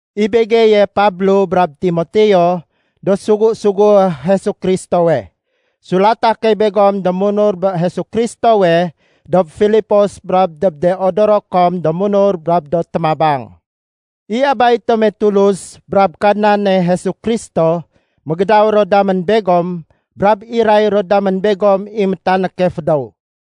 I begeye Pablo brab Timoteo do sugu-sugué Jesu Kristowe. Sulata key begom do munur bé Jesu Kristowe dob Filipos brab dob de odoro kom do munur brab do témabang. I Abay tome Tulus brab Kadnane Jesu Kristo mégédaw ro damén begom brab iray ro damén begom i métanéke fédéw.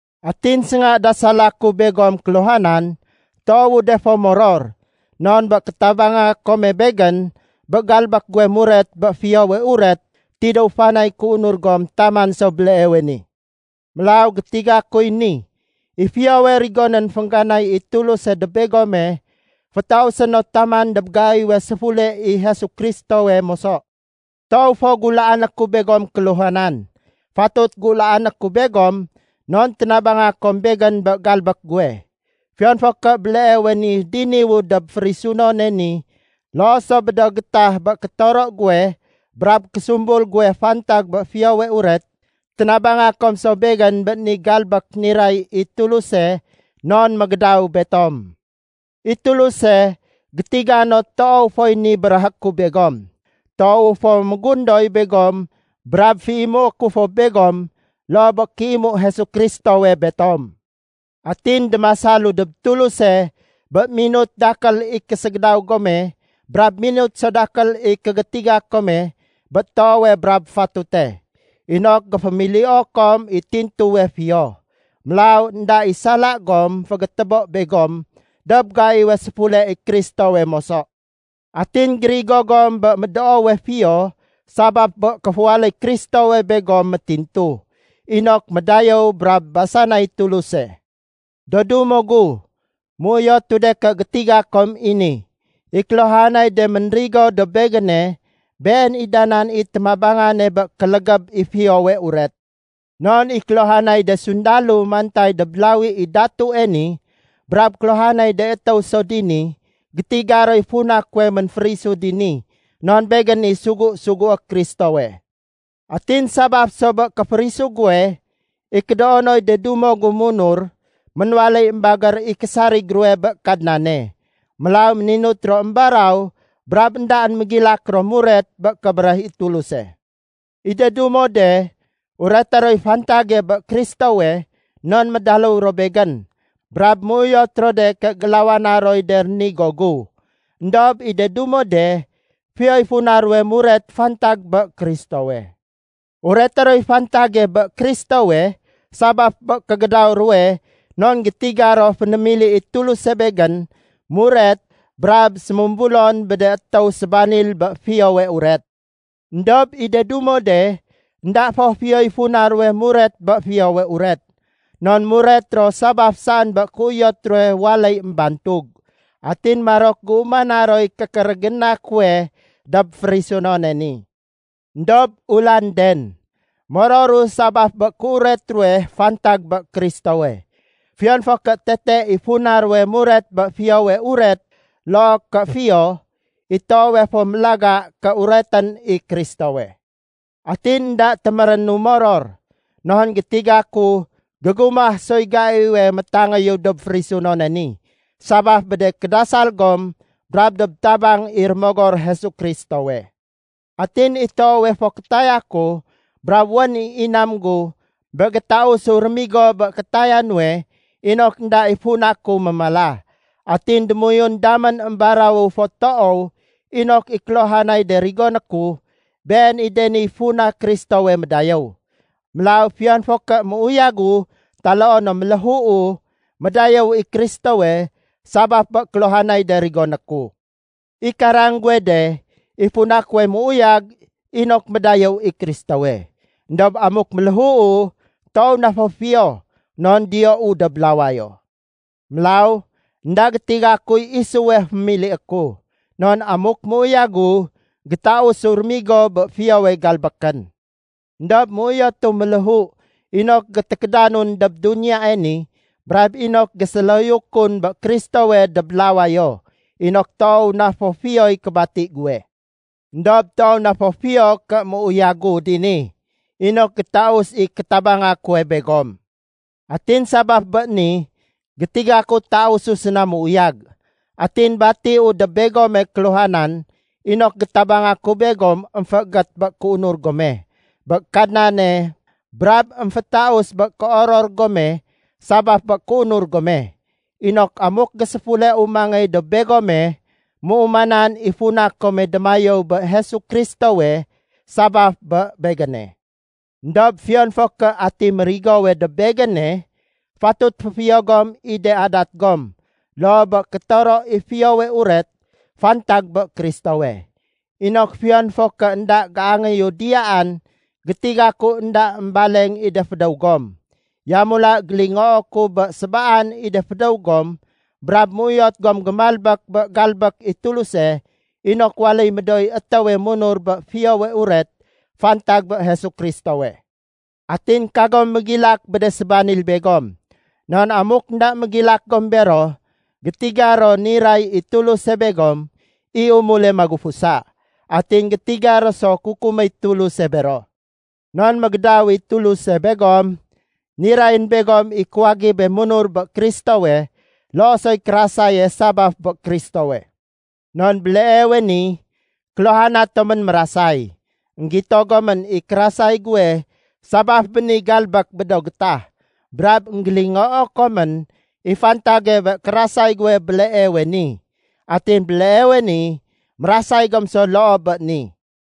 Atin sénga dasala ku begom kéluhanan, toowu de fo moror, non bé kétabanga kome begén bé galbék guwe muret bé Fiyowe Uret tidéw fanay kéunur gom taman so béleewe ni. Mélaw gétiga kuy ni: I fiyowe rigonén féngganay i Tuluse dob begome, fétausé no taman dob gaiwe séfule i Jesu Kristowe moso. Toow fo gulaané ku begom kéluhanan. Fatut gulaané ku begom non ténabanga kom begén bé galbék guwe. Fiyon fo ké béleewe ni diniwu dob férisunone ni loo so bé do gétah bé kétoro guwe brab késumbul guwe fantag bé Fiyowe Uret, ténabanga kom so begén bé ni galbék niray i Tuluse non mégédaw betom. I Tuluse gétiga no toow foy ni béréhé ku begom. Toowu fo mégundoy begom brab féimué ku fo begom loo bé kéimu Jesu Kristowe betom. Atin démasalu dob Tuluse bé minut dakél i késégédaw gome brab minut so dakél i kégétiga kome bé toowe brab fatute, inok géfémilio kom i tintuwe fiyo. Mélaw énda i sala gom fégétébo begom dob gaiwe séfule i Kristowe moso. Atin gérigo gom bé médoowe fiyo sabaf bé kéféwaléy Kristowe begom métintu, inok médayéw brab basanay Tuluse. Do dumo gu, méuyotu de ké gétiga kom i ni: I kéluhanay de ménrigo dob begéne, been i da nan i téménabange bé kélégéb i Fiyowe Uret. Non i kéluhanay de sundalo mantay dob lawi i datue ni brab kéluhanay de étéw so dini, gétiga roy funa kuwe ménférisu dini non begén i sugu-sugué Kristowe. Atin sabaf so bé kéférisu guwe, i kédoonoy de dumo gu munur ménwaléy émbagér i késarig ruwe bé Kadnane. Mélaw méninut ro émbaraw brab éndaén mégilak ro muret bé kébéréh i Tuluse. I de dumo de ureté roy fantage bé Kristowe non médaléw ro begén brab méuyot ro de ké gélawana roy de rénigo gu. Endob i de dumo de, fiyoy funa ruwe muret fantag bé Kristowe. Ureté roy fantage bé Kristowe sabaf bé kégédaw ruwe non gétiga ro fénémili i Tuluse begén muret brab sémumbulon bé de étéw sébanil bé Fiyowe Uret. Endob i de dumo de, énda fo fiyoy funa ruwe muret bé Fiyowe Uret. Non muret ro sabaf saén bé kéuyot ruwe waléy émbantug. Atin marok géumana roy kékérégéna kuwe dob férisunone ni. Endob ulanden! Mororu sabaf bé kéuret ruwe fantag bé Kristowe. Fiyon fo ké tete i funa ruwe muret bé Fiyowe Uret loo ké fiyo, i toowe fo mélaga ké uretén i Kristowe. Atin énda témérénu moror, non gétiga ku gégumah soy gaiwe métangéyu dob férisunone ni, sabaf bé de kédasal gom brab dob tabang i Rémogor Jesu Kristowe. Atin i toowe fo kétaya ku brab wén i inam gu bé gétausu rémigo bé kétaya nuwe inok énda i funa ku mémala. Atin démoyun damén émbarawu fo toow inok i kéluhanay de rigoné ku, been i de niy funa Kristowe médayéw. Mélaw fiyon fo ké méuyagu taloo no méléhuu, médayéw i Kristowe sabaf bé kéluhanay de rigoné ku. I karang guwe de, i funa kuwe méuyag inok médayéw i Kristowe. Endob amuk méléhuu, toow na fo fiyo, non diyou dob lawayo. Mélaw énda gétiga kuy isuwe fémilié ku. Non amuk méuyagu, gétausu rémigo bé fiyowe galbékén. Endob méuyotu méléhu inok gétékédanun dob duniyae ni brab inok géséloyukun bé Kristowe dob lawayo, inok toow na fo fiyoy kébati guwe. Endob toow na fo fiyo ké méuyagu dini inok gétaus i kétabanga kuwe begom. Atin sabaf bé ni, gétiga ku tausu séna méuyag. Atin batiu dob begome kéluhanan inok gétabanga ku begom émféégét bé kéunur gome bé Kadnane brab émfétaus bé kéoror gome sabaf bé kéunur gome, inok amuk géséfuleu mangéy dob begome, méumanan i funa kome démayéw bé Jesu Kristowe sabaf bé begéne. Endob fiyon fo ké ati mérigowe dob begéne, fatut féfiyo gom i de adat gom loo bé kétoro i Fiyowe Uret fantag bé Kristowe, inok fiyon fo ké énda géangéyu diyaan, gétiga ku énda émbaleng i de fédéw gom. Yamula gélingoo ku bé sébaan i de fédéw gom brab méuyot gom gémalbék bé galbék i Tuluse inok waléy médooy étéwe munur bé Fiyowe Uret fantag bé Jesu Kristowe. Atin kagom mégilak bé de sébanil begom. Non amuk énda mégilak gom bero, gétiga ro niray i Tuluse begom i umule magufusa, atin gétiga ro so kukuméy Tuluse bero. Non mégédaw i Tuluse begom, nirayén begom i kuwagibe munur bé Kristowe loo soy kérasaye sabaf bé Kristowe. Non béleewe ni kéluhana tomén mérasay. Enggito gomén i kérasay guwe sabaf bé ni galbék bé do gétah, brab énggélingoo komén i fantage bé kérasay guwe béleewe ni. Atin béleewe ni, mérasay gom so loo bé ni.